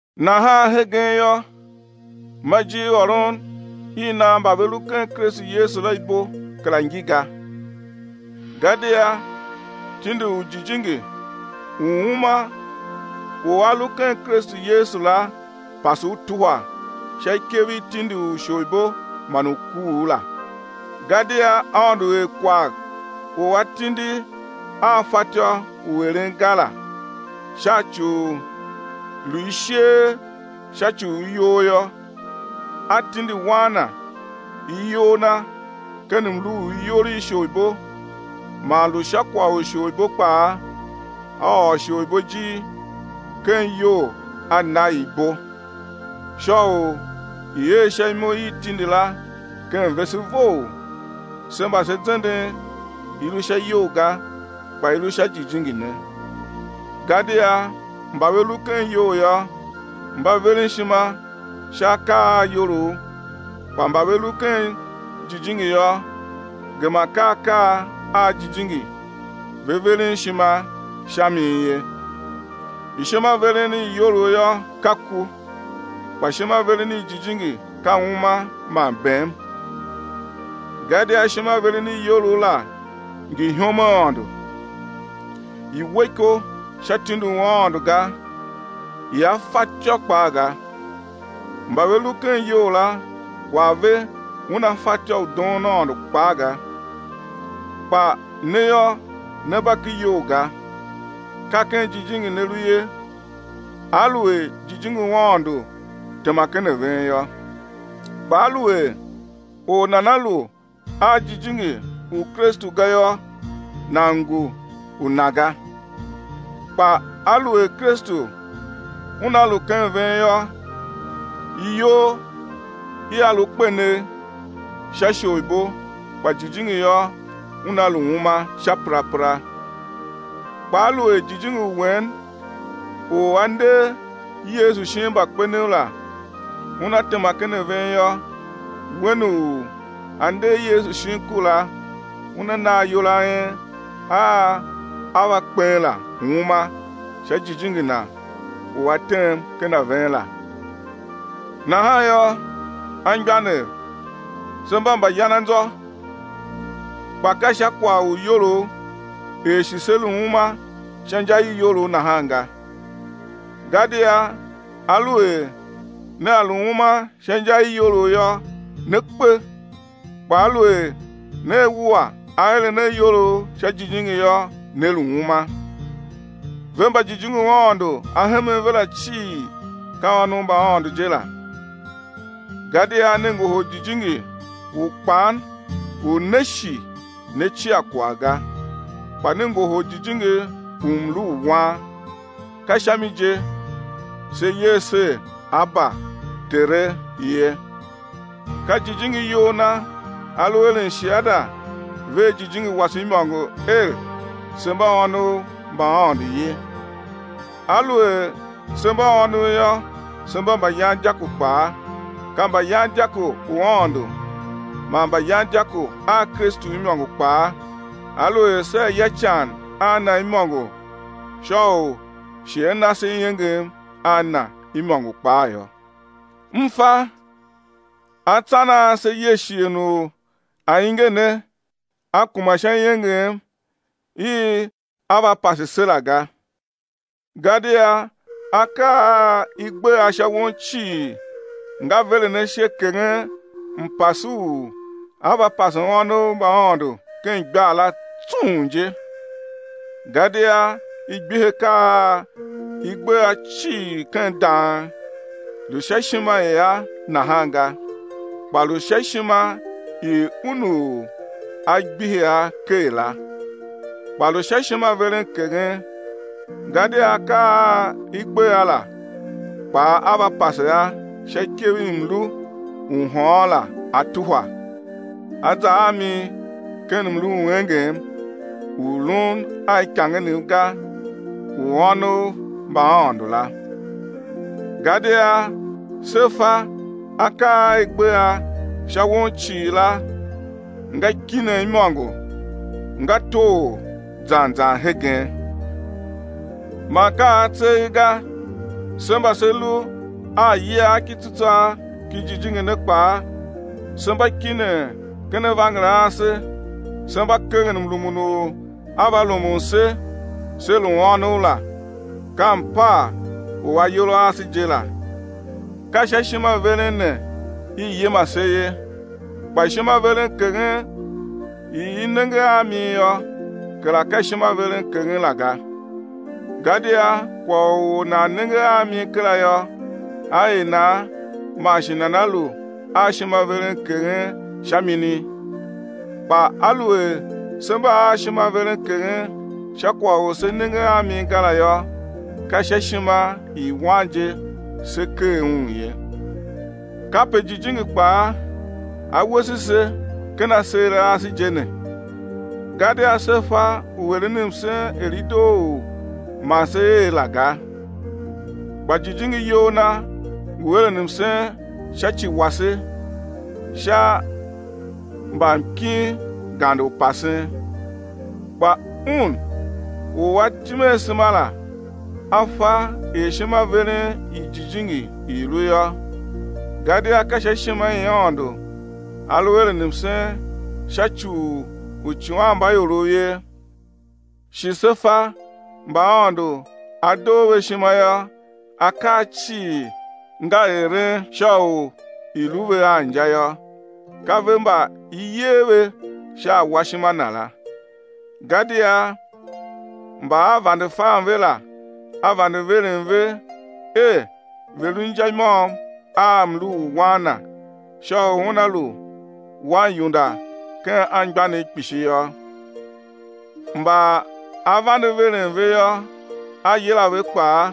Nahan hegen yô, ma ijirôron i nan mba ve lu ken Kristu Yesu la ibo kera ngi ga. Gadia tindi u Jijingi u uma u a lu ken Kristu Yesu la pase u tuhwa sha ikev i tindi u isholibo man u kuugh la. Gadia Aôndo er kwagh u atindi a fatyô u eren ga la, sha ci u lu isheer sha ci u iyol yô; A tindi Wan Na iyol Na ken mlu u iyol i isholibo man lu sha kwagh u isholibo kpaa, A ôr isholibo ijir ken iyol A na i ibo; sha u i̱ er sha imo i tindi la ken vese vough, se mba se zenden i lu sha iyol ga kpa i lu sha Jijingi ne. Gadia mba ve lu ken iyol yô, mba veren ishima sha akaa a iyolough; kpa mba ve lu ken jijingi yô, gema ka akaa a jijingi ve veren ishima sha mi ye. Ishimaveren i iyolough yô, ka ku, kpa ishimaveren i jijingi ka uma man bem. Gadia ishimaveren i iyolough la ngi ihom a Aôndo. I we iko sha tindi u Aôndo ga, ia fatyô kpaa ga. Mba ve lu ken iyol la, kwagh ve una fatyô u doon Aôndo kpaa ga. Kpa ne yô, ne mba ken iyol ga, ka ken jijingi ne lu ye aluer Jijingi u Aôndo tema ken a ven yô. Kpa aluer or nana lu a Jijingi u Kristu ga yô, nan ngu u Na ga. Kpa aluer Kristu Una lu ken ven yô, iyol ia lu kpenegh sha isholibo kpa jijingi yô una lu uma sha perapera. Kpa aluer Jijingi u Wen u A nder Yesu shin mbakpenev la Una tema ken ven yô, Wen u A nder Yesu shin ku la Una na ayol a en a á va kpen la uma sha Jijingi Na u A tem ken ven la. Nahan yô, anmgbianev se mba mbayananzô kpa ka sha kwagh u iyolough er shi sé lu uma sha inja i iyolough nahan ga. Gadia aluer nea lu uma sha inja i iyolough yô né kpe, kpa aluer nea wua aeren a iyolough sha Jijingi yô, né lu uma. Ve mba Jijingi u Aôndo A hemen ve la cii, ka ônov mba Aôndo je la. Gadia ne ngohol jijingi u kpan u né shi né cia kwagh ga kpa ne ngohol jijingi u mlu u wan, ka sha mi je se yer ser Aba, Tere ye. Ka Jijingi iyol Na A lu eren shiada vea jijingi wase imôngo er, se mba ônov mba Aôndo ye. Aluer se mba ônov yô, se mba mbayandyako kpaa, ka mbayandyako u Aôndo man mbayandyako a Kristu imôngo kpaa, aluer sea ya ican a na imôngo sha u shi á na se iengem a Na imôngo kpaa yô. M fa, atsan a se ye shighe u ainge ne a kuma sha iengem i á va pase se la ga. Gadia akaa a i gbe a sha won cii nga veren ashe keghen mpase u á va pase ônov mba Aôndo ken igbar la tsung je. Gadia i gbihi akaa a i gbe a cii ken dang, lu sha ishima i a nahan ga, kpa lu sha ishima i Un u A gbihi a ker la. Kpa lu sha ishimaverenkeghen, gadia akaa a i gbe a la kpaa á va pase a sha ikev i mlu u hôôn la á tuhwa, á za a mi ken mlu u engem u lun a ikangenev ga u ônov mba Aôndo la. Gadia se fa akaa a i gbe a sha won cii la nga kinen imôngo nga toghor zan zan hegen. Man ka a tseegh ga, se mba se lu a iyiagh ki tsutswagh ki Jijingi ne kpaa se mba kinen ken avanger a ase se mba keghen mrumun u á va rumun se sé lu ônov la, ka mpaa u ayol a ase je la. Ka sha ishimaveren ne i yima se ye. Kpa ishimaverenkeghen i i nenge a mi yô kera ka ishimaverenkeghen la ga. Gadia kwagh u or nan nenge a mi kera yô, á er nan man shi nana lu a ishimaverenkeghen sha mini? Kpa aluer se mba a ishimaverenkeghen sha kwagh u se nenge a mi ga la yô, ka sha ishima i wan je se kegh un ye. Kape Jijingi kpaa A wese se ken aseer a ase je ne, gadia se fa u eren msen er i doo u ma se er la ga, kpa Jijingi iyol Na ngu eren msen sha ci wase sha mbamkin gande u pasen. Kpa Un u A tim asema la A fa er ishimaveren i Jijingi i lu yô, gadia ka sha ishima i Aôndo A lu eren msen sha ci u uicighanmbaiorov ye. Shi se fa mba Aôndo A doo ve ishima yô, akaa cii nga eren sha u i̱ lu ve a inja yô, ka ve mba i yer ve sha awashima Na la. Gadia mba A vande fan ve la, A vande veren ve er ve̱ lu inja i môm a mlu u Wan Na sha u Una lu Waniunda ken anmgbianev kpishi yô; mba A vande veren ve yô, A yila ve kpaa;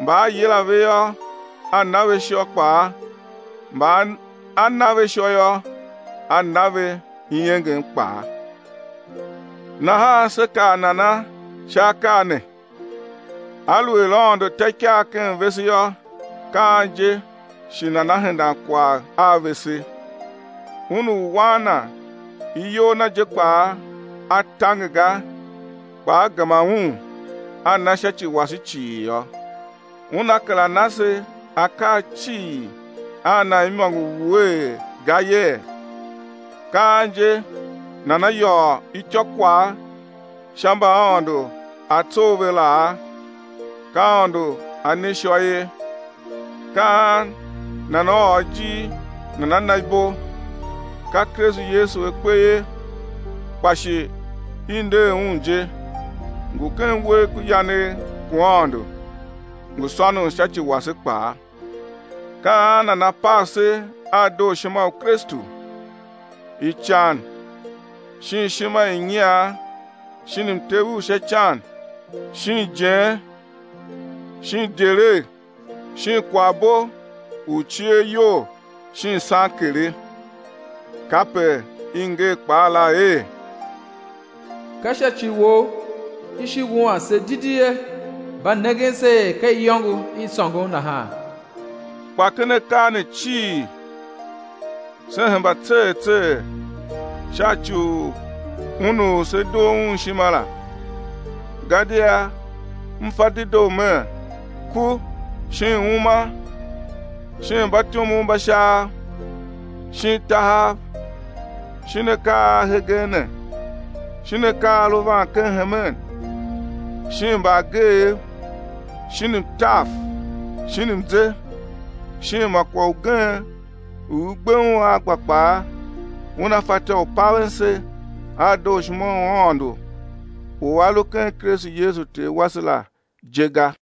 mba A yila ve yô, A na ve ishô kpaa; mba A na ve ishô yô, A na ve iengem kpaa. Nahan sé kaa nana sha akaa ne? Aluer Aôndo ta ikaa ken vese yô, ka an je shi nana hendan kwagh a vese? Un u Wan Na iyol Na je kpaa A tange ga kpa A gema Un A na sha ci wase cii yô, Una kera na se akaa cii a Na imôngo wuee ga yee? Ka an je nana yôô ityôkwagh sha mba Aôndo A tsough ve laa? Ka Aôndo A ne ishô ye. Ka an nana ôr ijir nana na ibo? Ka Kristu Yesu A kpe ye, kpa shi i nder Un je, ngu ken uwegh ku yanegh ku Aôndo, ngu sônon sha ci wase kpaa. Ka an nana pav se a dooshima u Kristu? Ican shin ishima i nyian shin mtev u sha ican shin ijen shin idyelegh shin kwaghbo u cier iyol shin sankere? Kape i nger kpaa la er: Ka sha ci Wou i shi wuan se didi ye, mba nengen se er ka iyôngo i sôngon nahan. Kpa ken akaa ne cii se hemba tser tser sha ci u Un u se doo Un ishima la. Gadia m fa dedoo mer, ku shin uma, shin mbatyomov mba Shaav, shin tahav, shin akaa a hegen ne, shin akaa a lu van ken hemen, shin mbaageev, shin mtav, shin mze, shin ma kwagh ugen u i gbe un a gba kpaa, una fatyô u paven se a dooshima u Aôndo u a lu ken Kristu Yesu Ter wase la je ga.